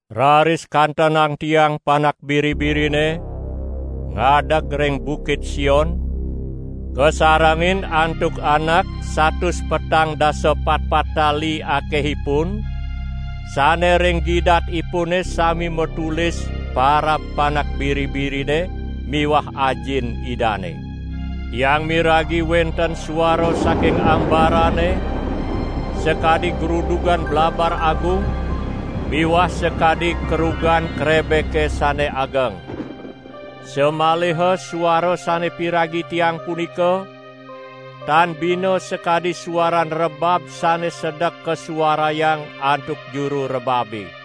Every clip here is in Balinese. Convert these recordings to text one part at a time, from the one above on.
Raris kantenang tiang Panak Biri-birine ngadeg ring Bukit Sion kasarengin antuk anak satus petang dasa patpat tali akehipun, sane ring gidatipune sami matulis parab Panak Biri-birine miwah Ajin Idane. Tiang miragi wenten suara saking ambarane sakadi grudugan blabar agung miwah sakadi kerugan krebeke sane ageng. Samaliha suara sane piragi tiang punika tan bina sakadi suaran rebab sane sedek kasuarayang antuk juru rebabe.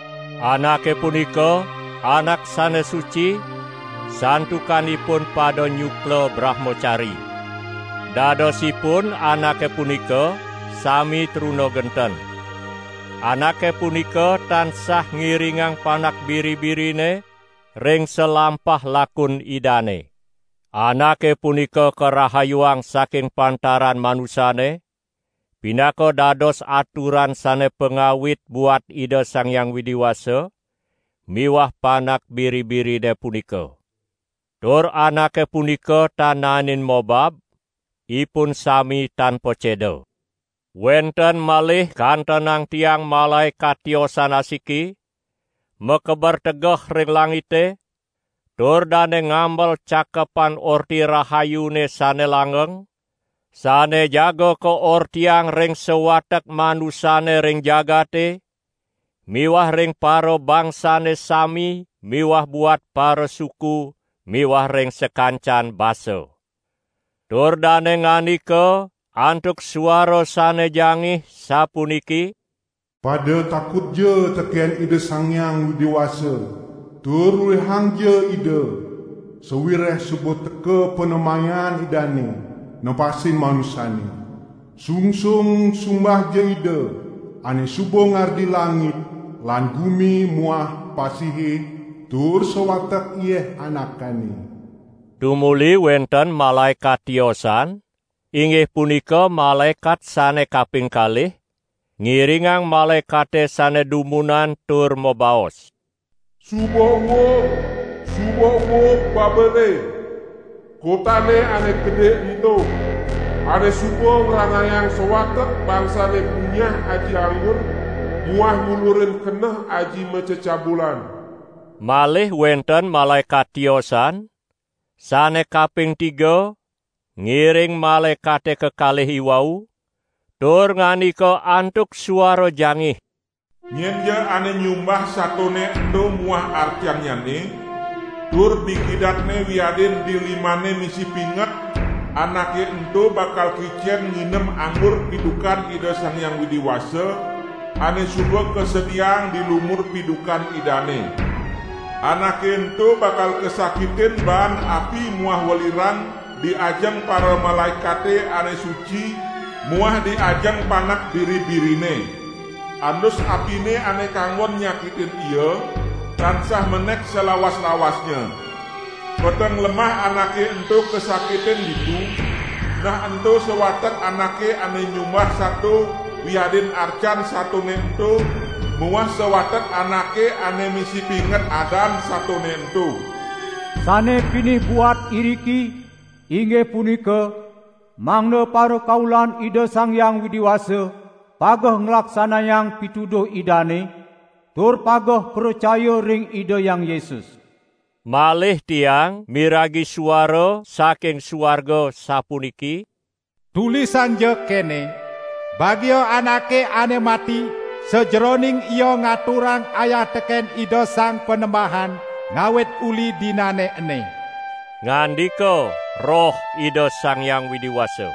Anake punika, anak sane suci, santukan ipun pada nyukla brahmacari. Dadosipun anake punika sami truna genten. Anake punika tansah ngiringang Panak Biri-birine ring salampah lakun Idane. Anake punika karahayuang saking pantaran manusane pinaka dados aturan sane pangawit buat Ida Sang Hyang Widi Wasa miwah Panak Biri-birine punika. Tur anake punika tan naenin mobab, ipun sami tan paceda. Wenten malih kantenang tiang malaekat tiosan asiki, makeber tegeh ring langite, tur dane ngamel Cakepan Orti Rahayune sane langgeng, sane jaga kaortiang ring sawatek manusane ring jagate, miwah ring parabangsane sami miwah buat parasuku miwah ring sakancan basa. Tur dane ngandika antuk suara sane jangih sapuniki: "Pada takutja teken Ida Sang Hyang Widi Wasa tur luihangja Ida, sawireh suba teka panemayan Idane nepasin manusane. Sungsung sumbahja Ida ane suba ngardi langit lan gumi muah pasihe tur sawatek yeh anakane!" Tumuli wenten malaekat tiosan, inggih punika malaekat sane kaping kalih, ngiringang malaekate sane dumunan tur mabaos: "Suba uug, suba uug Babele, kotane ane gede ento, ane suba ngranayang sawatek bangsane punyah aji anggur muah ngulurin keneh aji macecabulan!" Malih wenten malaekat tiosan, sane kaping tiga, ngiring malaekate kekalih iwau, tur ngandika antuk suara jangih: "Nyenja ane nyumbah satone ento muah arcannyane, tur di gidatne wiadin di limanne misi pinget, anake ento bakal kicen nginem anggur pidukan Ida Sang Hyang Widi Wasa, ane suba kasediang di lumur pidukan Idane. Anake ento bakal kasakitin baan api muah welirang di ajeng paramalaekate ane suci muah di ajeng Panak Biri-birine. Andus apine ane kanggon nyakitin ia tansah menek salawas-lawasnya. Peteng lemah anake ento kasakitin ditu, nah ento sawatek anake ane nyumbah sato wiadin arcan satone ento muah sawatek anake ane misi pinget adan satone ento." Sane pinih buat iriki, inggih punika mangda parakaulan Ida Sang Hyang Widi Wasa pageh nglaksanayang pituduh Idane tur pageh pracaya ring Ida Hyang Yesus. Malih tiang miragi suara saking suarga sapuniki: "Tulisangja kene! Bagia anake ane mati sajeroning ia ngaturang ayah teken Ida Sang Panembahan, ngawit uli dinane ene!" Ngandika Roh Ida Sang Hyang Widi Wasa: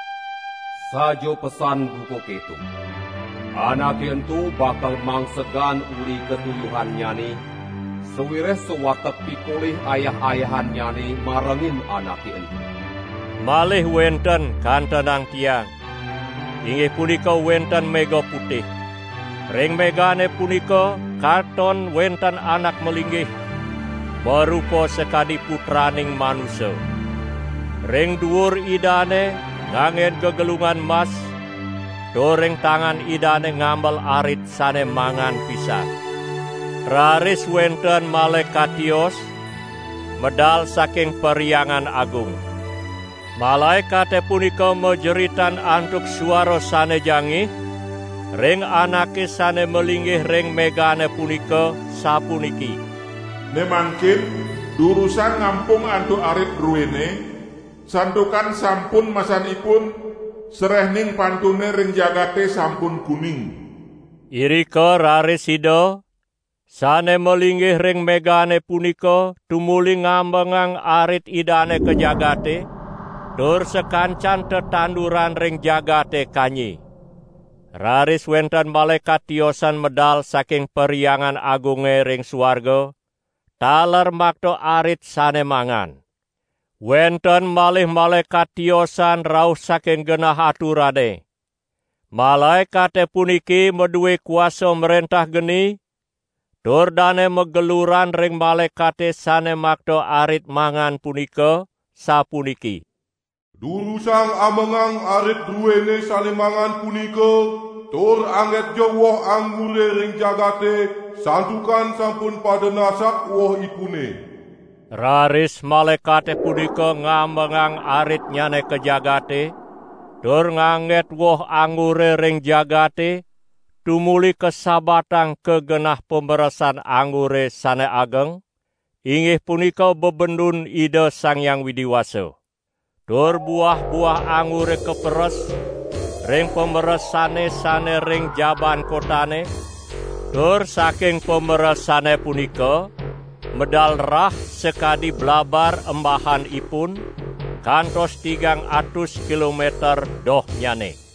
"Saja pesan buka keto! Anake ento bakal mangsegan uli katuyuhannyane, sawireh sawatek pikolih ayah-ayahannyane marengin anake ento." Malih wenten kantenang tiang, inggih punika wenten mega putih. Ring megane punika katon wenten Anak malinggih, marupa sakadi Putraning Manusa. Ring duur Idane nganggen gegelungan mas tur ring tangan Idane ngamel arit sane mangan pisan. Raris wenten malaekat tios, medal saking Perhyangan Agung. Malaekate punika majeritan antuk suara sane jangih ring Anake sane malinggih ring megane punika sapuniki: "Ne mangkin durusang ngampung antuk arit druene, santukan sampun masanipun, sarehning pantune ring jagate sampun kuning!" Irika raris Ida, sane malinggih ring megane punika tumuli ngamengang arit Idane ka jagate, tur sakancan tetanduran ring jagate kanyi. Raris wenten malaekat tiosan medal saking Perhyangan Agunge ring suarga, taler makta arit sane mangan. Wenten malih malaekat tiosan rauh saking genah aturane. Malaekate puniki madue kuasa mrentah geni tur dane mageluran ring malaekate sane makta arit mangan punika sapuniki: "Durusang amengang arit druene sane mangan punika tur anggetja woh anggure ring jagate santukan sampun pada nasak wohipune!" Raris malaekate punika ngamengang aritnyane ka jagate, tur ngangget woh anggure ring jagate tumuli kasabatang ka genah pameresan anggure sane ageng, inggih punika bebendun Ida Sang Hyang Widi Wasa. Tur buah-buah anggure kaperes ring pameresane sane ring jabaan kotane, tur saking pameresane punika medal rah sakadi blabar embahanipun kantos tigang atus kilometer dohnyane.